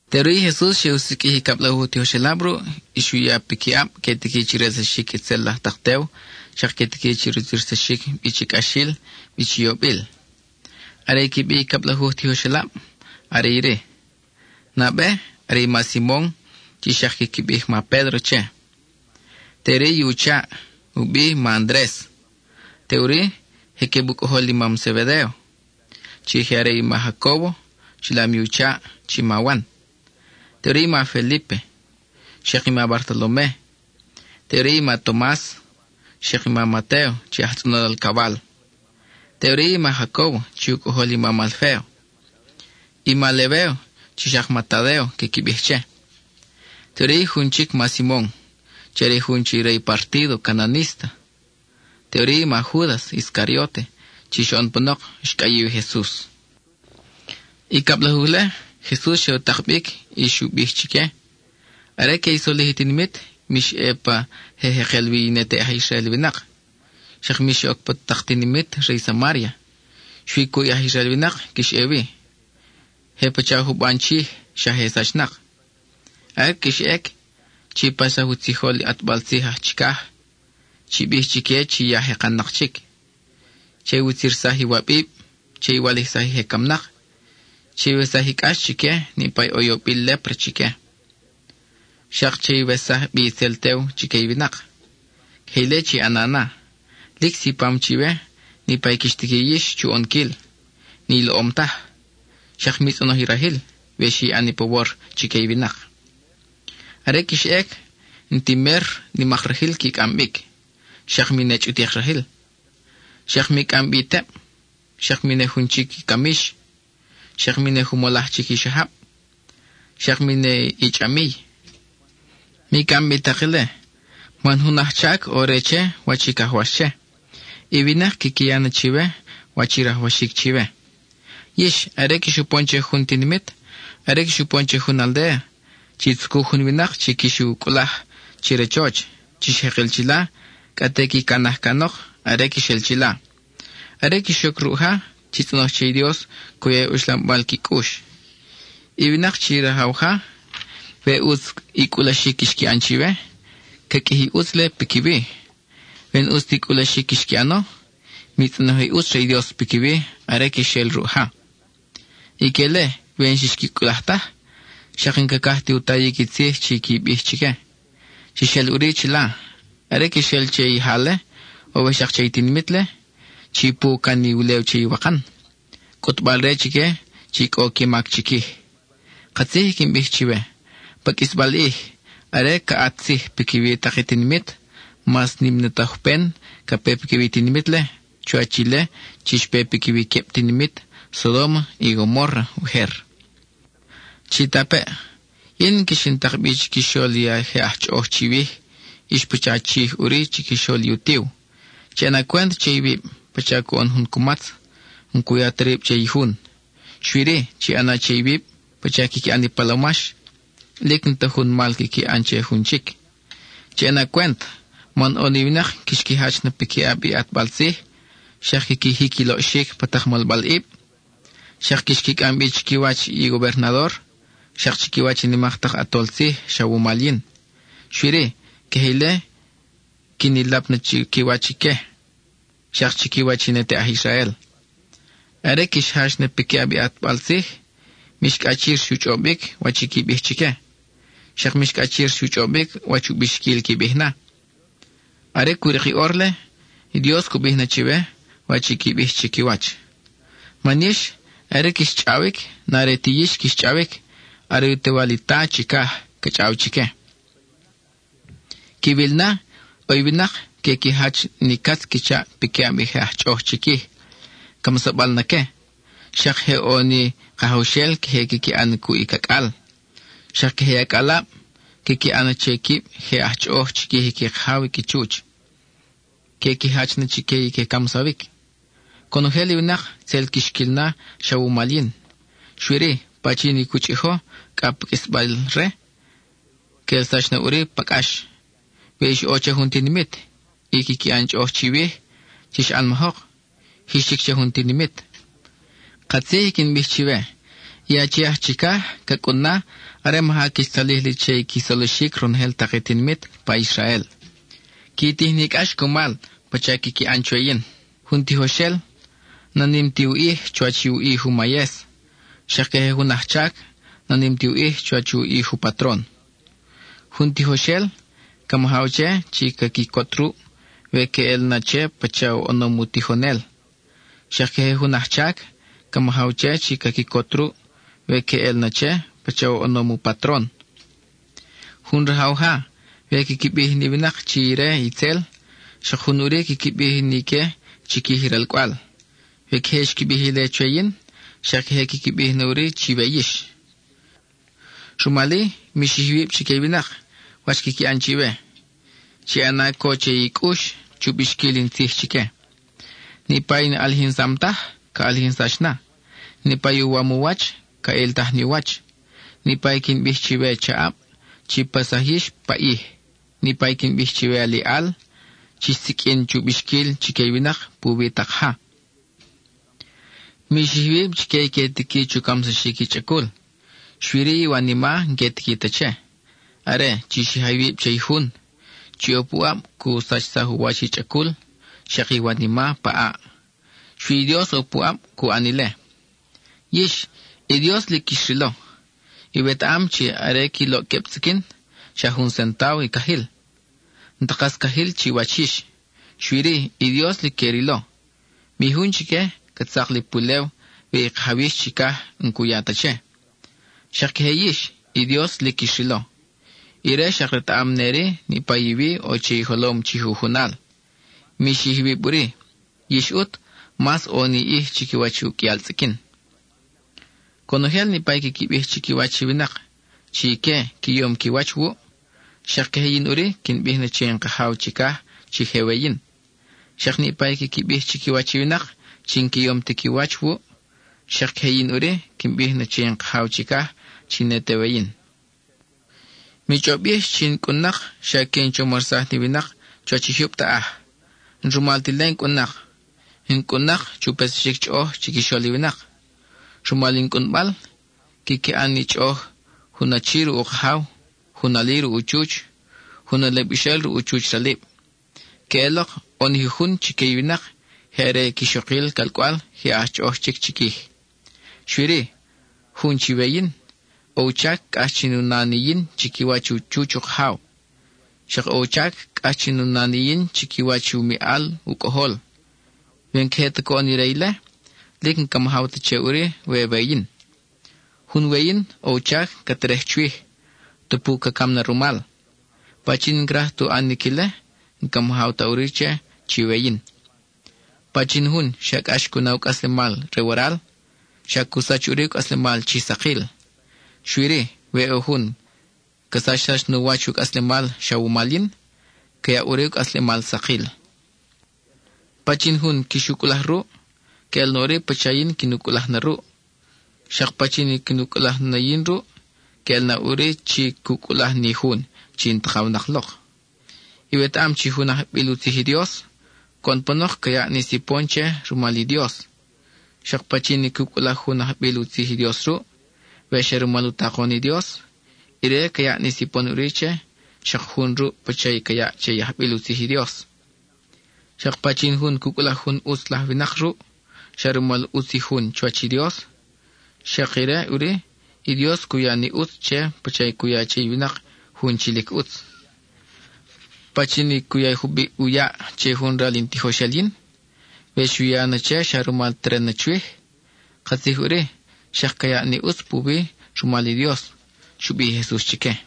Teʼuri i Jesus xe u siqʼuij i cablajuj tijoxelab ruʼ y xu ya piquiʼab que tiqui chi relsaxic itzel laj tak tew, xak que tiqui chi rutzirsaxic bi chi cʼaxil, bi chi yobil. Are i qui bi i cablajuj tijoxelab are iri: nabe, are i ma Simon chi xak quiqui bij “ma Pédro” che; teʼuri i u chaʼ, u bi ma Andres; teʼuri, je queb u cʼojol i mam Zebedéo: i ma Jacóbo, chilam i u chaʼ chi ma Wan; teʼuri i ma Felípe, xak i ma Bartolome; teʼuri i ma Tomas, xak i ma Matéo chi aj tzʼonol alcawal; teʼuri i ma Jacóbo chi u cʼojol i mam Alféo; i ma Lebéo chi xak ma Tadéo quiqui bij che; teʼuri i jun chic ma Simon, are i jun chi re i partído cananísta; teʼuri i ma Júdas Iscarióte chi xoʼon panok xcʼayiw i Jesus. I cablajuj-le, Jesus xe u tak bic, y xu bij bi chique: —Are que i solij i tinimit, mix ʼe pa i je jekel wi i ne te aj Israel winak; xak mix oc pa tak tinimit re i Samária. Xui cuʼ i aj Israel winak quix ʼe wi; je pacha juban chij, xa je sachnak. Are quix ʼec, chi paxsaj u tzijol i ʼatbal tzij aj chicaj; chi bij chique chi ya ca jekanic. Che iwutzirsaj iwabib; che i walijsaj i je camnak; chiwesaj i cʼax chique niʼpa ʼo i yobil lépra chique; xak che iwesaj bi itzel tew chique i winak. Queje ile chi ʼana na. Lic sipam chiwe niʼpa quix tiqui yix chu ʼonquil, ni loʼom taj. Xak mi tzʼonoj i rajil, we xi ʼan i pawor chique i winak. Are quix ʼec, n-ti mer nimak rajil qui cʼam bic, xak mi ne chʼutik rajil. Xak mi cʼam bi i teb, xak mi ne jun chic i camix, xak mi ne jumolaj chic i xajab, xak mi ne i chʼamiy. Mi cʼam bi tak ile, man jun ajchac ʼo re che, wach i cajwax che; i winak quiqui ya na chiwe wach rajwaxic chiwe. Yix, are quix upon che jun tinimit, are quix upon che jun aldéa, chi tzucuj jun winak chi quix u cʼulaj che rachoch; chix jekel chila, cʼa te qui canaj canok are quix el chila. Are quix oc ruʼ ja, chi tzʼonoj che i Dios cu ya i uxlambal qui cʼux. I winak chi rajaw ja, we ʼutz i cʼulaxic xqui ʼan chiwe, ca qʼuiji i ʼutz-le piquiwi. We n-ʼus ta i cʼulaxic xqui ʼano, mi tzʼonoj i ʼutz re i Dios piquiwi are quix el ruʼ ja. Ique-le, we n-xix qui cʼulaj taj, xak n-cacaj ti u tayic i tzij chi qui bij chique, chix el ʼuri chila. Are quix el che i ja-le, o we xak che i tinimit-le, chi pu can i ulew che iwakan (cʼutbal-re chique chi cʼo qui mac chiquij). Katzij i quin bij chiwe: pa qʼuisbal ʼij, are ca ʼat tzij piquiwi tak i tinimit, mas nim na i tojpen ca pe piquiwi i tinimit-le chuwach ile chi xpe piquiwi i queb tinimit Sodóma y Gomórra ujer. Chitapeʼ, yin quix in tak bi chiquixol i je aj chʼoʼoj chiwij; ix pacha chij ʼuri chiquixol i utiw. Chi ʼana cwent che iwib, pacha coʼon jun cumatz, n-cu ya ta rib che i jun. Xui-ri, chi ʼana che iwib pacha quiqui ʼan i palomax, lic n-ta jun mal quiqui ʼan che jun chic. Chi ʼana cwent, man ʼo ni winak quix qui jach na piquiʼab i ʼatbal tzij, xak quiqui jic i loʼxic pa tak molbalʼib. Xak quix qui cʼam bi chiquiwach i gobernador, xak chiquiwach i nimak tak ʼatol tzij xa wumal yin. Xui-ri, queje ile quin i lap na chiquiwach ique, xak chiquiwach i ne te aj Israel. Are quix jach na piquiʼab i ʼatbal tzij, mix cʼachir chu chʼobic wach i qui bij chique, xak mix cʼachir chu chʼobic wach u bixquil qui bij na. Are cu rik i ʼor-le, Dios cu bij na chiwe wach i qui bij chiquiwach. Man yix, are quix chʼawic, n-are ti yix quix chʼawic, are u Tewal i Ta chicaj ca chʼaw chique. Quiwil na, ʼo i winak que qui jach ni catz qui chaʼ piquiʼab i je aj chʼoʼoj chiquij, camsabal na que; xak je ʼo ni kajawxel queje quiqui ʼan cuʼ i cacʼal. Xak queje i acʼalab, quiqui ʼan che quib je aj chʼoʼoj chiquij i qui kajaw i qui chuch, que qui jach na chique i que camsawic. Conojel i winak tzel quix quil na xa wumal yin: xui-ri pachin i cu chʼijo cʼa pa qʼuisbal ie, que ʼelsax na ʼuri pa cʼax. We ix ʼo che jun tinimit y quiqui ʼan chʼoʼoj chiwij, chix ʼanmajok; jix chic che jun tinimit. Katzij i quin bij chiwe, i Achi aj Chicaj ca cʼun na, are maja quix tzalij li che i qui solixic ronojel tak i tinimit pa Israel. (Qui tij ni cʼax cumal, pacha quiqui ʼan chwe yin.) Jun tijoxel, na nim ti u ʼij chuwach u ʼij u mayes; xak queje jun ajchac, na nim ti u ʼij chuwach u ʼij u patron. Jun tijoxel, ca majaw che chi ca quicot ruʼ, we queʼel na che pacha oʼonom u tijonel; xak queje jun ajchac, ca majaw che chi ca quicot ruʼ we queʼel na che pacha oʼonom u patron. Jun rajaw ja, we quiqui bij ni winak chi ire itzel, xak jun ʼuri quiqui bij na ique chiquij i ralcʼwal. (We queje xqui bij ile chwe yin, xak queje quiqui bij na ʼuri chiwe yix.) Rumal-i, mi xij iwib chique i winak, wach quiqui ʼan chiwe. (Chi ʼana co che i cʼux chu bixquil in tzij chique.) Niʼpa i n-ʼalijinsam taj, ca ʼalijinsax na; niʼpa i uwam u wach, ca ʼiltaj ni u wach. Niʼpa i quin bij chiwe chaʼab, chi paxsaj yix pa ʼij; niʼpa i quin bij chiwe aliʼal, chix siqʼuin chu bixquil chique i winak puwi tak ja. Mi xij iwib chique i que tiqui chu camsaxic i chʼacul, xui-ri i iwanima n-que tiqui ta che. Are, chi xija iwib che i Jun, chi ʼo puʼab cu sachsaj u wach i chʼacul xak i iwanima pa ʼaʼ. (Xui i Dios ʼo puʼab cu ʼan ile.) Yix, i Dios lic quix rilo. Iwetaʼam chi are qui loʼ queb tzʼiquin xa jun centávo i cajil. N-ta kas cajil chiwach yix. Xui-ri, i Dios lic que u rilo; mi jun chique ca tzak li pulew we i Kajaw yix chicaj n-cu ya ta che. Xak queje yix, i Dios lic quix rilo. Ire xak retaʼam neri niʼpa i wi ʼo che i jolom chi jujunal. Mi xij iwib ʼuri; yix ʼut, mas ʼo ni ʼij chiquiwach uqʼuial tzʼiquin. Conojel niʼpa i quiqui bij chiquiwach i winak chi ique qui yom qui wach wuʼ, xak queje yin ʼuri, quin bij na che in Kajaw chicaj chi je we yin. Xak niʼpa i quiqui bij chiquiwach i winak chi n-qui yom ti qui wach wuʼ, xak queje yin ʼuri, quin bij na che in Kajaw chicaj chi ne te we yin. Mi chʼob yix chi in cʼun-nak xa que in chomarsaj ni winak chuwach i jyub taʼaj. N-rumal ta ile in cʼun-nak; in cʼun-nak chu petsaxic chʼoʼoj chiquixol i winak. Rumal in cʼunbal, quiqui ʼan ni chʼoʼoj jun achi ruʼ u kajaw, jun ali ruʼ u chuch, jun alibaxel ruʼ u chuch ralib. Queʼelok ʼo ni jujun chique i winak je are quixokil calcʼwal je aj chʼoʼoj chic chiquij. Xui-ri, jun chi we-yin, ʼo u chac cʼax chin u na ni yin chiquiwach u chuch u kajaw. Xak ʼo u chac cʼax chin u na ni yin chiquiwach u miʼal u cʼojol. We n-queje ta coʼon ire ile, lic n-ca majaw ta che ʼuri we we-yin. Jun we-yin ʼo u chac ca terej chwij, tupu ca cam na rumal. Pachin n-craj ti u ʼanic ile, n-ca majaw ta ʼuri che chi we-yin. Pachin jun xa cʼax cu na u cʼaslemal re waral, xa cu sach ʼuri u cʼaslemal chi sakil. Xui-ri, we ʼo jun ca sachsax nu wach u cʼaslemal xa wumal yin, ca yaʼ ʼuri u cʼaslemal sakil. Pachin jun quix u cʼulaj ruʼ, queʼel na ʼuri pacha yin quin u cʼulaj na ruʼ. Xak pachin i quin u cʼulaj na yin ruʼ, queʼel na ʼuri chi cu cʼulaj ni Jun chi in takawnak lok. Iwetaʼam chi jun ajbil u tzij i Dios, coʼon panok ca yaʼ ni sipon che rumal i Dios. Xak pachin i cu cʼulaj jun ajbil u tzij i Dios ruʼ, we xa rumal u takon i Dios, ire ca yaʼ ni sipon ʼuri che xak jun ruʼ pacha i ca yaʼ che i ajbil u tzij i Dios. Xak pachin jun cu cʼulaj jun ʼutz laj winak ruʼ, xa rumal ʼutz i jun chuwach i Dios, xak ire ʼuri i Dios cu ya ni ʼutz che pacha i cu ya che i winak jun chi lic ʼutz. Pachin jun cu ya jubiʼ u yaʼ che jun ral in tijoxel yin, we xu ya na che xa rumal teren na chwij, katzij ʼuri xak ca yaʼ ni ʼutz puwi rumal i Dios —xu bij i Jesus chique.